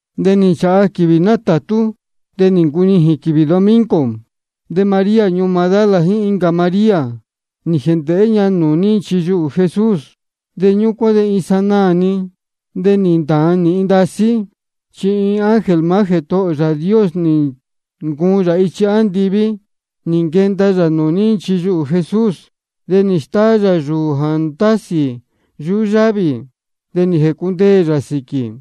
De nī nchāha quīvī nátātú, de nī ncunijīn quīvī domingo. De María ñuū Magdala jíín incā María, nī jēndēhé ña nūū ní nchiyuhū Jesús. Ñúcuán de iin sanaā-ni de nī ntāan nīhin ndasí. Chi iin ángel maá Jētohō ō Yāā Dios nī ncuun yā ichi andiví, nī nquenda yā nūū ní nchiyuhū Jesús. De nī stáá yā yūū jā ndásī yuhú yávī, de nī jēcundeē yā sīquī.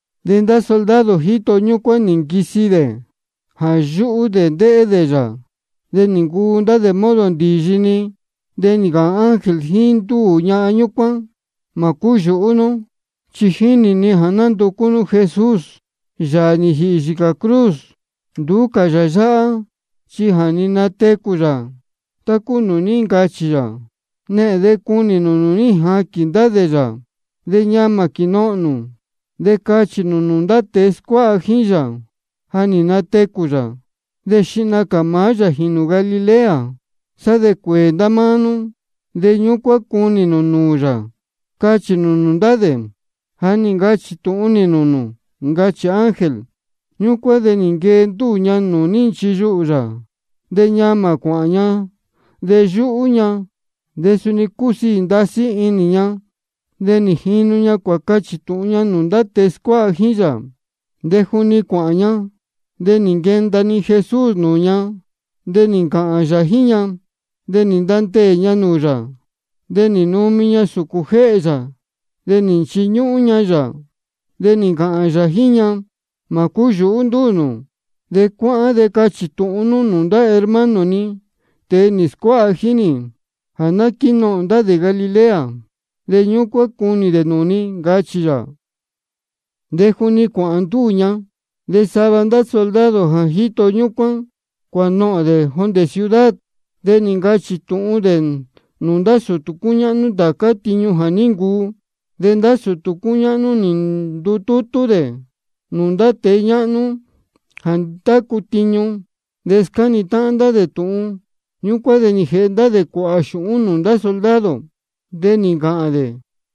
De ndá soldado jíto ñúcuán nī nquisi dē jā yúhú dē ndéhé dē yā. De nī ncuu ndá dē modo ndīyi-ni. De nī ncāhān ángel jíín ndúū ñahan ñúcuán: Mā cúyūhú nú, chi jínī ni jā nánducú nú Jesús, Yāā nī jīhī yīcā cruz. Nduú cā yā yáhá, chi ja nī natecū yā, tá cúu nūū ní ncachī yā. Nehēn de cunī nū nūū ní jaquīn ndá dē yā. De ñamā quīnohōn nū, de cachī nū nūū ndá tēe scuáha jíín yā jā ní natecū yā. De xihna cā maá yā jīnū Galilea, sá de cuēē ndá máá nú, de ñúcuán cunī nū nūū yā, cachī nū nūū ndá dē. Ja nī ncachī tūhun nī nūū nū, ncachī ángel. Ñúcuán de nī nquee ndúū ña nūū ní nchiyuhū yā, de ñamā cuāhān ña. De yúhú ña, de suni cúsiī ndasí inī ña. De nī jinu ña cuācachī tūhun ña nūū ndá tēe scuáha jíín yā. De juni cuāhān ña, de nī nquenda-ni Jesús nūū ña, de nī ncāhān yā jíín ña. De nī ntandeē ña nūū yā, de nī numi ña sūcūn jéhē yā, de nī nchiñúhún ña yā. De nī ncāhān yā jíín ña: Mā cúyūhú ndúū nū. De cuáhán de cachī tūhun nú nūū ndá hermano ni, tēe nī scuáha jíín nī, jā ná quínohōn ndá dē Galilea, de ñúcuán cunī dē nūū ni, ncachī yā. De juni cuāhān ndúū ña, de sava soldado jā ní jito ñúcuán, cuānohōn dē jondē ciudad. De nī ncachī tūhun dē nūū ndá sūtū cúñáhnú ndācá tiñu jā ní ncuu. De ndá sūtū cúñáhnú nī ndutútú dē nūū ndá tēe ñáhnú jā ndácu tiñu, de nī scáni táhán dē tūhun. Ñúcuán de nī jēhe dē cuāhā xūhún nūū ndá soldado. De nī ncāhān dē: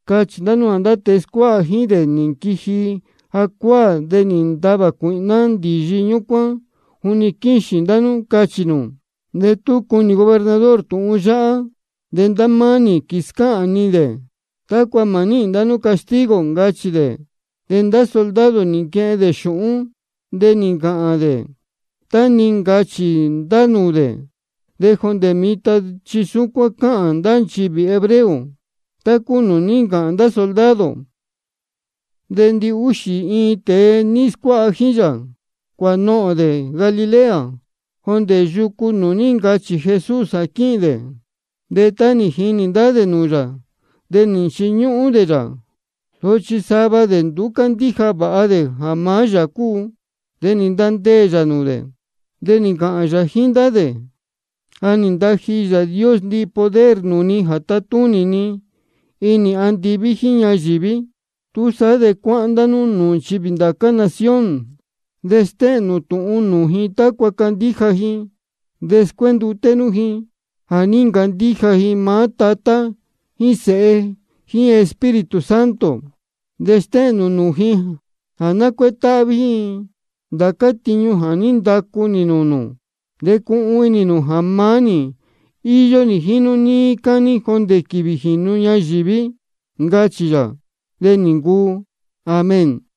Cachī ndá nú jā ndá tēe scuáha jíín dē nī nquiji jacuáā, de nī natavā cuīhná ndīyi ñúcuán juni quíxīn ndá nú, cachī nū. De tú cuni gobernador tūhun yáhá, de ndá máá nī quīscáhān ni dē, tácua mā níhīn ndá nú castigo, ncachī dē. De ndá soldado nī nquehen dē xūhún, de nī ncāhān dē tá nī ncachī ndá nūū dē. De jondē mitan chi súcuán cáhān ndá nchivī hebreo tá cúu nūū ní ncāhān ndá soldado. De ndihúxī iin tēe nī scuáha jíín yā, cuānohōn dē Galilea, jondē yucu nūū ní ncachī Jesús jā quíhīn dē. De tá nī jinī ndá dē nūū yā, de nī nchiñúhún dē yā. Sochi sava dē nduú cándíja vāha dē jā maá yā cúu. De nī ntandeē yā nūū dē, de nī ncāhān yā jíín ndá dē: Ja nī ntaji Yāā Dios ndihi poder nūū ni jā tatúnī ni inī andiví jíín ñayīví. Túsaá de cuáhán ndá nú nūū nchivī ndācá nación, de stéhēn nū tūhun nī nūū ji tácua candíja ji. De scuénduté nú ji jā ní ncandíja ji maá Tatá jíín Sēhe jíín Espíritu Santo. De stéhēn nū nūū ji jā ná cuétáhví ji ndācá tiñu jā ní ndacu nī nūū nū. De cuhun inī nū jā maá nī íyó nī jíín nú níí cání jondē quīvī jā jīnu ñayīví, ncachī yā. De nī ncuu. Amén.